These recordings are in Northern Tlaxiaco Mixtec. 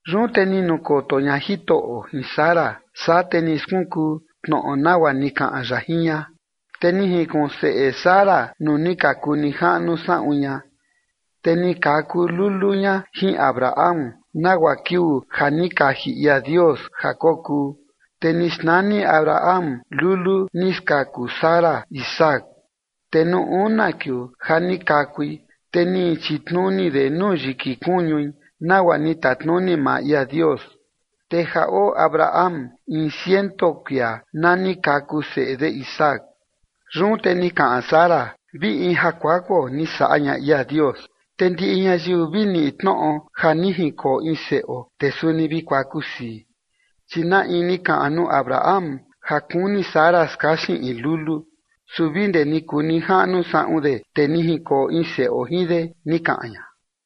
Yun te ni nukoto ña Jitoꞌo jin Sara, saa te ni skunkuu tnoꞌo nagua ni kaꞌan ya jin ña. Te ni jinkuꞌun seꞌe Sara nuu ni ka kuu nijaꞌnu saꞌun ña, te ni kaku lulu ña jin Abraham nagua kiuu ja ni kaji ia Dios ja kokuu. Te ni xnani Abraham lulu ni skaku Sara Isaac. Te nuu una kiuu ja ni kakui, te ni chitnuni de nuu yiki kuñui, nagua ni tatnuni maa ia Dios. Te ja oo Abraham in ciento kuia na ni kaku seꞌe de Isaac. Yun te ni kaꞌan Sara: “Vi in ja kuakuo ni saꞌa ña ia Dios, te ndiꞌi ñayiu vi niꞌi tnoꞌo ja ni jinkoo in seꞌo, te suni vi kuaku sii. Chi na in ni kaꞌan nuu Abraham ja kuni Sara skaxin in lulu, su vi ndee ni kuu nijaꞌnu saꞌun de, te ni jinkoo in seꞌo jin de”, ni kaꞌan ña.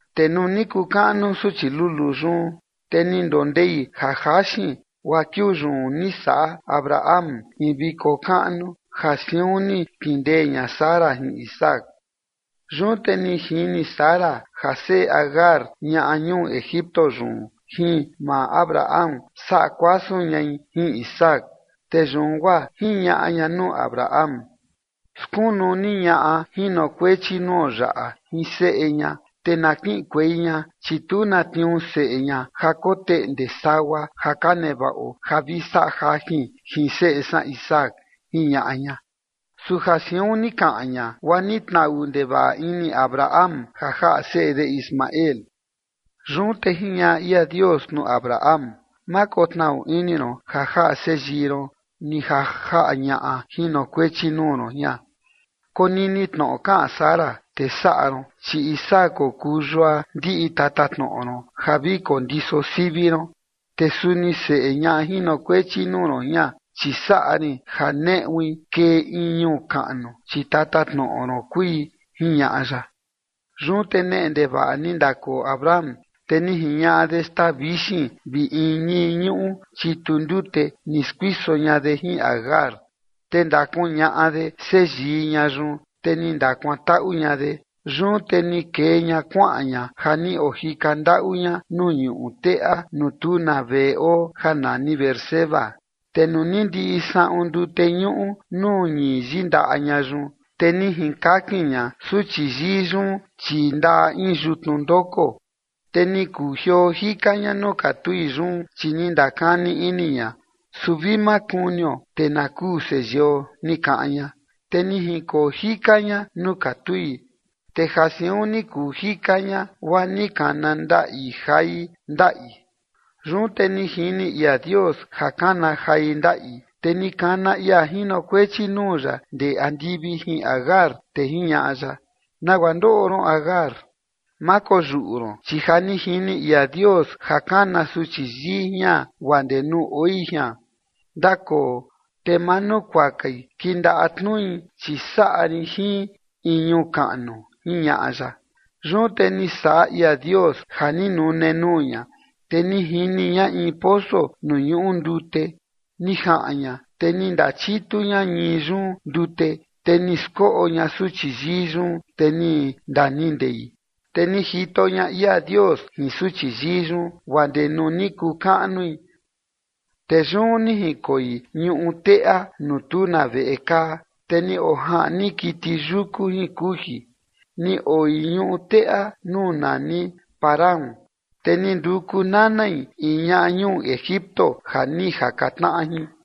Te nuu ni kuu kaꞌnu suchi luluu yun, te ni ndondei ja jaxin, guaa kiuu yun ni saꞌa Abraham in viko kaꞌnu ja siun ni kindee ña Sara jin Isaac. Yun te ni jini Sara ja seꞌe Agar ñaꞌa ñuu Egipto yun jin maa Abraham saꞌa kuasun ñai jin Isaac. Te yun guaa jiñaꞌa ña nuu Abraham: ―Skunu ni ñaꞌa jinokuechi nuo yaꞌa jin seꞌe ña, te na kiꞌinkuei ña, chi tu na tniuu seꞌe ña ja koteꞌnde sagua ja ka nevaꞌo ja vi saꞌa jajin jin seꞌe san Isaac ―jiñaꞌa ña. Su ja siun ni kaꞌan ña, guaa ni tnaꞌu ndevaꞌa ini Abraham ja jaꞌa seꞌe de Ismael. Yun te jiñaꞌa ia Dios nuu Abraham: ―Ma kotnaꞌu ini ron ja jaꞌa seyii ron ni ja jaꞌa ñaꞌa jinokuechi nuu ron jian. Konini tnoꞌo kaꞌan Sara te saꞌa ron, chi Isaac kokuu yua ndiꞌi tatatnoꞌo ron ja vi kondiso sivi ron. Te suni seꞌe ñaꞌa jinokuechi nuu ron jian, chi saꞌa rin ja neꞌui kee in ñuu kaꞌnu, chi tatatnoꞌo ron kui ―jiñaꞌa ya. Yun te neꞌe ndevaꞌa ni ndakoo Abraham, te ni jiñaꞌa de xtaa vixin vi in ñii ñuꞌu chitu ndute ni skuiso ña de jin Agar, te ndakuñaꞌa de seyii ña yun, te ni ndakuantaꞌu ña de. Yun te ni kee ña kuaꞌan ña ja ni ojika ndaꞌu ña nuu ñuꞌu teꞌa nuu tu na veꞌe oo ja nani Beerseba. Te nuu ni ndiꞌi saꞌun ndute ñuꞌu nuu ñii yindaꞌa ña yun, te ni jinkakin ña suchi yii yun chii ndaꞌa in yutnu ndoko. Te ni kujioo jika ña nuu katui yun, chi ni ndakani ini ña: ―Su vi ma kunio te na kuu seyio ―ni kaꞌan ña. Te ni jinkoo jika ña nuu katui. Te ja siun ni kuu jika ña, guaa ni kana ndaꞌi jai. Yun te ni jini ia Dios ja kana jai ndaꞌi, te ni kana ia jinokuechi nuu ya ndee andivi jin Agar, te jiñaꞌa ya: ―¿Nagua ndoꞌo ron Agar? Ma koyuꞌu ron, chi ja ni jini ia Dios ja kana suchi yii jian guaa ndee nuu oi jian. Ndakoo te manukuakai kindaꞌa tnui, chi saꞌa rin jin in ñuu kaꞌnu ―jiñaꞌa ya. Yun te ni saꞌa ia Dios ja ni nune nuu ña, te ni jini ña in poso nuu ñuꞌu ndute, ni jaꞌan ña te ni ndachitu ña ñii yun ndute, te ni skoꞌo ña suchi yii yun, te ni ndaniꞌi ndei. Te ni jito ña ia Dios jin suchi yii yun, guaa ndee nuu ni kuu kaꞌnui, te yun ni jinkoi ñuꞌu teꞌa nuu tu na veꞌe kaa, te ni ojaꞌni kiti yuku jin kuji. Ni oi ñuꞌu teꞌa nuu nani Parán, te ni nduku nanai in ñaꞌa ñuu Egipto ja ni jaka tnaꞌa jin.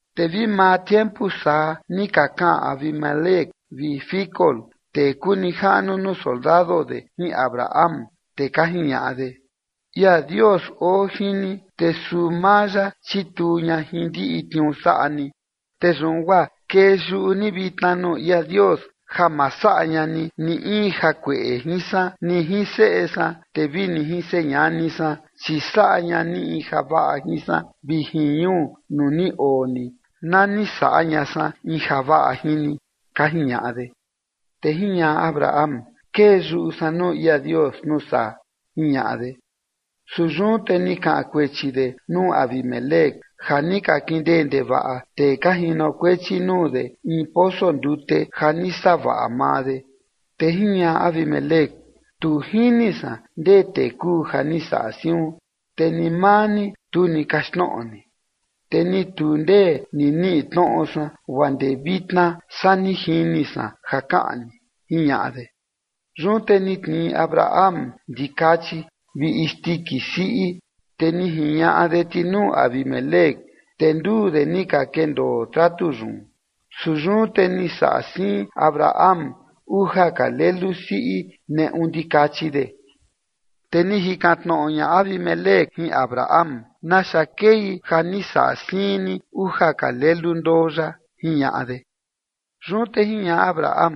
Te vi maa tiempu saa ni ka kaꞌan Abimelec vi Ficol, tee kuu nijaꞌnu nuu soldado de jin Abraham, te ka jiñaꞌa de: ―Ia Dios oo jin ni, te suu maa ya chituu ña jin ndiꞌi tniuu saꞌa ni. Te yun guaa kee yuꞌu ni vitna nuu ia Dios ja ma saꞌa ña ni ni in jakueꞌe jin san ni jin seꞌe san, te vi ni jin señani san, chi saꞌa ña ni in javaꞌa jin san vi jin ñuu nuu ni oo ni na ni saꞌa ña san in javaꞌa jin ni ―ka jiñaꞌa de. Te jiñaꞌa Abraham: ―Kee yuꞌu san nuu ia Dios nuu saa ―jiñaꞌa de. Su yun te ni kaꞌan kuechi de nuu Abimelec ja ni ka kindee ndevaꞌa tee ka jinokuechi nuu de in poso ndute ja ni savaꞌa maa de. Te jiñaꞌa Abimelec: ―Tu jini san ndee tee kuu ja ni saꞌa siun, te ni maa ni, tu ni kaxtnoꞌo ni, te ni tu ndee ni niꞌi tnoꞌo san guaa ndee vitna saa ni jini san ja kaꞌan ni ―jiñaꞌa de. Yun te ni tnii Abraham ndikachi vi isndiki siꞌi, te ni jiñaꞌa de ti nuu Abimelec, te nduu de ni ka kendoo tratu yun. Su yun te ni saꞌa siin Abraham uja ka lelu siꞌi neꞌu ndikachi de. Te ni jikan tnoꞌo ña Abimelec jin Abraham: ―¿Naxa kei ja ni saꞌa siin ni uja ka lelu ndoo yaꞌa? ―jiñaꞌa de. Yun te jiñaꞌa Abraham: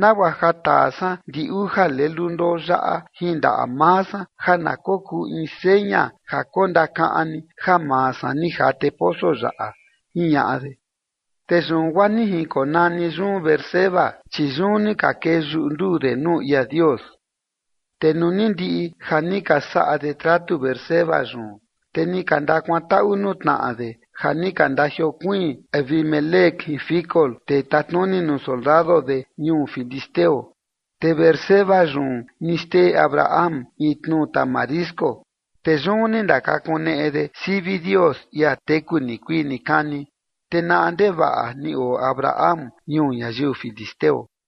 ―Nagua ja taa san ndi uja lelu ndoo yaꞌa jin ndaꞌa maa san ja na kokuu in seña ja kondakaꞌan ni ja maa san ni jate poso yaꞌa ―jiñaꞌa de. Te yun guaa ni jinkonani yun Beerseba, chi yun ni ka kee yuꞌu nduu de nuu ia Dios. Te nuu ni ndiꞌi ja ni ka saꞌa de tratu Beerseba yun, te ni ka ndakuantaꞌu nuu tnaꞌa de ja ni ka ndajiokuiin Abimelec jin Ficol tee tatnuni nuu soldado de ñuu filisteo. Te Beerseba yun ni xtee Abraham in tnu tamarisco, te yun ni ndakakuneꞌe de sivi Dios, ia teku nikuii nikani. Te naꞌa ndevaꞌa ni oo Abraham ñuu ñayiu filisteo.